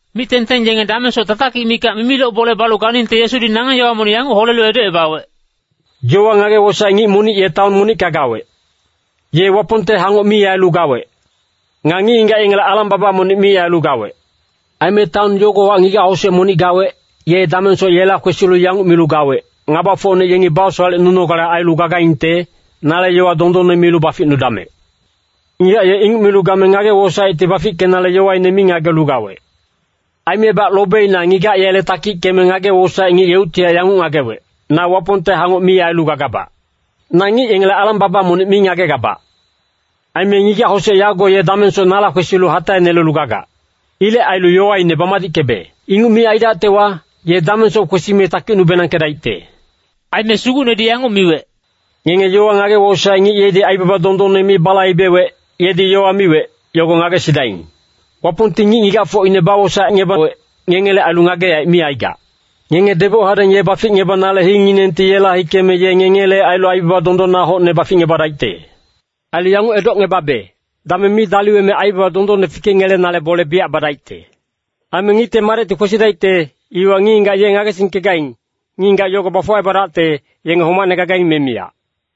Mic-tengteng yenge damengsoc tatakic mikac mimiloc bole balu ganingte Yesudi nangeng yowa monic yanguc holelu edocebawec, “Yowa ngage-wosaec ngic monic ye taon monicka gawec. Ye Wapongte hangoc mi ailu gawec. Nga ngic-ngigac yengele alang-baba monic mi ailu gawec. Aime taon yogowahac ngigac-hosec monic gawec, ye damengsoc yela kwesilu yanguc milu gawec, ‘Ngabafocne yengi basowalecnunogale ailu gagaingte, nale yowa dondonne milu baficnudamec.’ “Ngigac ye inguc milu game ngage-wosaecti bafickenale yowaine mi ngagelu gawec. Aimebac lobeina ngigac yele takickeme ngage-wosaec ngic yeuctihac yanguc ngagewec, ‘Na Wapongte hangoc mi ailu gagabac. Nga ngic yengele alang-baba monic mi ngagegabac. Aime ngigac-hosec yago ye damengsoc nala kwesilu hataenelelu gagac. Ilec ailu yowaine bamadickebe. Inguc mi aidactewa, ye damengsoc kwesime takicnu-benangkedaicte.’” Aime Sugucnedi yanguc miwec, “Ngenge yowa ngage-wosaec ngic yedi aibaba dondonne mi balaibewec, yedi yowa miwec, yogo ngagesidaing. Wapongti ngic-ngigacfocine bawosaecngebawec, ngengele ailu ngage-yaec mi aigac. Ngenge deboc hadeng ye baficngebanale hinginengti yela hikeme ye ngengele ailu aibaba dondonna hocne baficngebadaicte. Ailu yanguc edocngebabe, dameng mi daliweme aibaba dondonne fikengelenale bole biyac badaicte. Aime Ngicte Madecti kwesidaicte, iwa ngic-ngigac ye ngagesingkegaing, ngic-ngigac yogo bafuwacebadacte, yenge homacne gagaing me miyac.”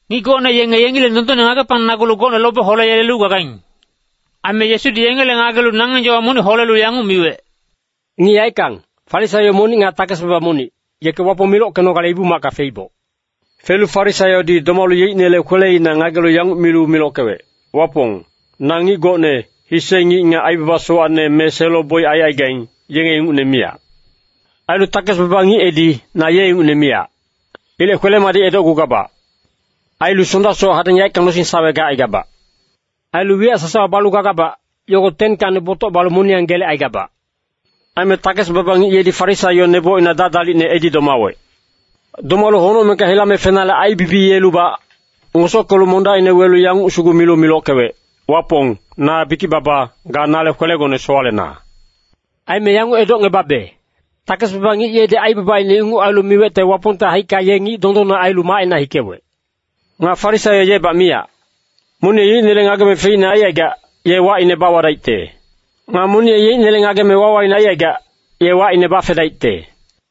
Ngic gocne yenge yengileng dondonne ngagepangnagulu gocne lobe holeyelelu gagaing. Aime Yesudi yengele ngagelu nangeng yowa monic holelu yanguc miwec, “Ngic yaeckang, Farisaio monic nga takes-baba monic, yeke Wapong milockenogale Ibu-macka feiboc. Felu Farisaiodi domalu yeicnele kweleina ngagelu yanguc milu milockewec, ‘Wapong, na ngic gocne, hise ngic nga aibaba sowacne me selo-boic aicaigaing, yenge ingucne miyac. Ailu takes-baba ngic edi, na ye ingucne miyac. Ilec kwele-madic edocgugabac. Ailu Sondasoc hadeng yaeckang nosing-sawe gacaigabac. Ailu wiyac sasawa balu gagabac, yogo 10kacni botoc balu moniyang gelecaigabac.’ “Aime takes-baba ngic yedi Farisaio nebocina dadalicne edi domawec. Domalu honocmengka hilame fenale aibibiyelubac, ngosockelu mondacina welu yanguc sugu milu milockewec, ‘Wapong, na bikic-baba, ga nale kwelegone sowalena.’ “Aime yanguc edocngebabe, takes-baba ngic yedi aibabaine inguc ailu miwecte Wapongte haicka ye ngic dondonne ailu macina hikewec. Nga Farisaio yebac miyac. Monic ye yeicnele ngageme feicne aicaigac, ye wacine bawadaicte. Nga monic ye yeicnele ngageme wawaine aicaigac, ye wacine bafedaicte.”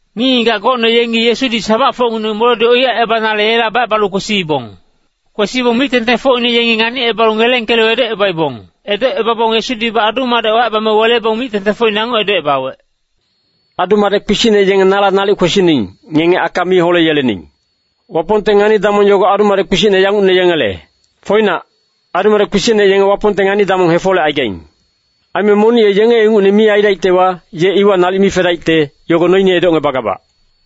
Ngic-ngigac gocne yenge Yesudi sabacfocngineng moledi oiyacebanale yela bacebalu kwesiibong. Kwesibong mic-tengtengfocine yengi nganicebalubac ngelengkelu edocebaibong. Edocebabong Yesudibac adu-madec wacebame welebong mic-tengtengfocine yanguc edocebawec, “Adu-madec kpisicne yenge nala nalic kwesining, ngenge aka mi holeyelening. Wapongte ngani-damong yogo adu-madec kpisicne yangucne yengele. Foinac, adu-madec kpisicne yenge Wapongte ngani-damong hefolecaigaing. Aime monic ye yenge ingucne mi aidaictewa, ye iwa nalic mi fedaicte, yogo noine edocngebagabac.”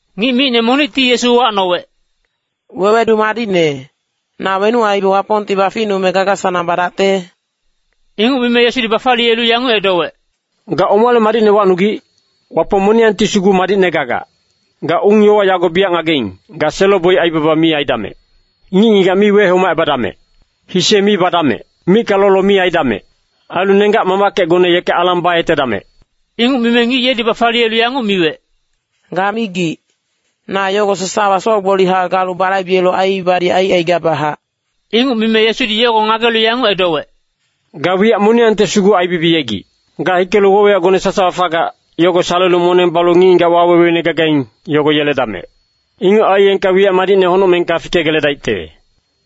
Ngic micne monicti Yesu uwacnowec, “Wewedu madicne, na wenuc aibe Wapongti baficnume gaga-sanang badacte?” Inguc mime Yesudi bafaliyelu yanguc edowec, “Ga omale madicne wacnugic? Wapong moniyangti sugu madicne gagac. Ga ung-yowa yago biyac ngageing, ‘Ga selo-boic aibaba mi aidamec. Ngic-ngigac mi wehomacebadamec. Hise mi badamec. Micka lolo mi aidamec. Ailu nenggac-mamackecgone yeke alang bayetedamec.’” Inguc mime ngic yedi bafaliyelu yanguc miwec, “Ga migic, na yogo sasawa soc-gbolihac galu balaibelu aiibadi aicaigabachac.” Inguc mime Yesudi yogo ngagelu yanguc edowec, “Ga wiyac moniyangte sugu aibibiyegic. Ga hikelu woc-wiyacgone sasawa fagac, yogo salelu moneng balu ngic-ngigac waweweine gagaing, yogo yeledamec. Inguc aiyengka wiyac madicne honocmengka fikegeledaicte.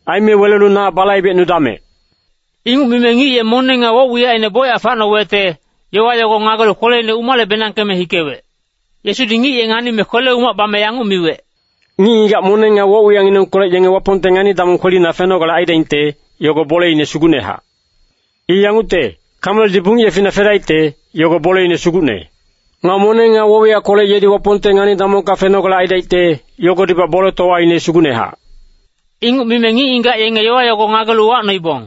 Aime welelu na balaibecnudamec.” Inguc mime ngic ye moneng nga woc-wiyacine bocyac facnowecte, yowa yogo ngagelu kweleine umale-benangkeme hikewec. Yesudi ngic ye nganime kwele-umac bame yanguc miwec, “Ngic-ngigac moneng nga woc-wiyacnginengkolec yenge Wapongte ngani-damong kwelina fenogale aidaingte, yogo boleine sugucnehac. I yangucte, Kameldi bungic yefina fedaicte, yogo boleine sugucne. Nga moneng nga woc-wiyackolec yedi Wapongte ngani-damongka fenogale aidaicte, yogodibac boletowaine sugucnehac.” Inguc mime ngic-ngigac yenge yowa yogo ngagelu uwacnoibong,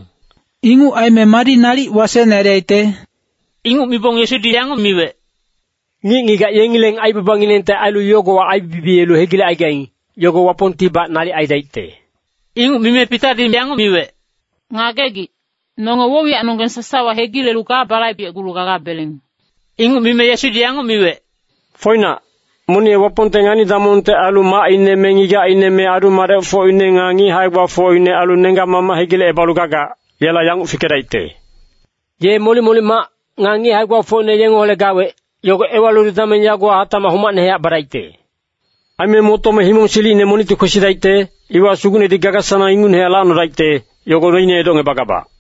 “Inguc aime madi nalic wasecne aidaicte?” Inguc mibong Yesudi yanguc miwec, “Ngic-ngigac yengileng aibabanginengte ailu yogowa aibibiyelu hegilecaigaing, yogo Wapongtibac nalic aidaicte.” Inguc mime Pitadi yanguc miwec, “Ngagegic, nonge woc-wiyacnonggeng sasawa hegilelu ga balaibecgulu gagabeleng.” Inguc mime Yesudi yanguc miwec, “Foinac, monic ye Wapongte ngani-damongte ailu macine me ngigacine me adu-madecfocine nga ngic hae-gbafocine ailu nenggac-mamac hegilecebalu gagac, yela yanguc fikedaicte. Ye molic-molic mac, nga ngic hae-gbafocine yengeholec gawec, yogo ewalilu dameng yagowa hatacmac homacnehac badaicte. Aime motome himong silicine monicti kwesidaicte, iwa Sugucnedi gaga-sanang ingucnehac lacnodaicte, yogo noine edocngebagabac.”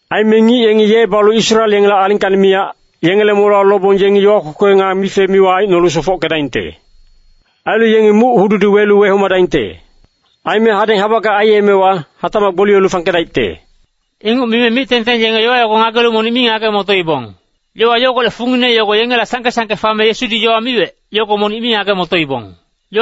Aime ngic yengi ye balu Israel yengele alingkacni miyac, yengele molewa lobong yengi yowa kwekwe nga mife-miwa aicnolu sofockedaingte. Ailu yengi muc-hududi welu wehomadaingte. Aime hadeng habackang aiyemewa, hatacmac gboliyelu fangkedaicte.” Inguc mime mic-tengteng yenge yowa yogo ngagelu monic mi ngage-motoibong. Yowa yogolec fungine yogo yengela sangke-sangke fame Yesudi yowa miwec, yogo monic mi ngage-motoibong.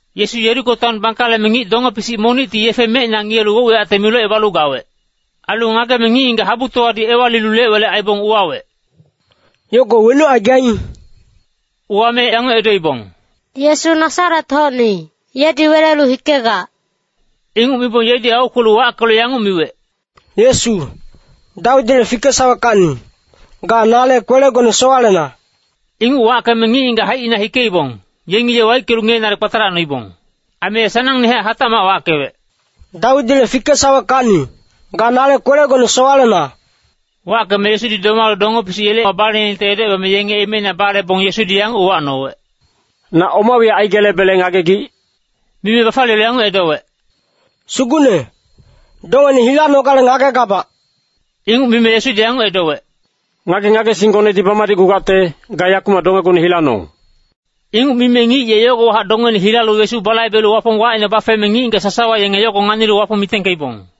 Yesu Yeriko taon bangkaleme, ngic donge-pisic monicti yefe mecina ngiyelu woc-wiyacte milocebalu gawec. Ailu ngageme ngic-ngigac habutowadi ewalilu lec-welec aibong uwawec, “Yogo wenuc aigaing?” Uwame yanguc edoibong, “Yesu Nasaret-hocni, yedi welelu hikegac.” Inguc mibong yedi aukwelu wackelu yanguc miwec, “Yesu, Dawidile fikesaweckacni, ga nale kwelegone sowalena.” Inguc wackeme ngic-ngigac haicina hikeibong, yengi ye waickelu ngiyenale kpatalacnoibong. Aime ye sanangnehac hatacmac wackewec, “Dawidile fikesaweckacni, ga nale kwelegone sowalena.” Wackeme Yesudi domalu donge-pisic yela baleningte edocebame yenge emeina balebong Yesudi yanguc uwacnowec, “Na oma wiyac aigelebele ngagegic?” Mime bafaliyelu yanguc edowec, “Sugucne, dongene hilanogale ngagegabac.” Inguc mime Yesudi yanguc edowec, “Ngage-ngagesinggonedi bamadicgugacte, ga yakumac dongegone hilanong.” Inguc mime ngic ye yogowahac dongeine hilalu Yesu balaibelu Wapong wacine bafeme, ngic-ngigac sasawa yenge yogo nganilu Wapong mitengkeibong.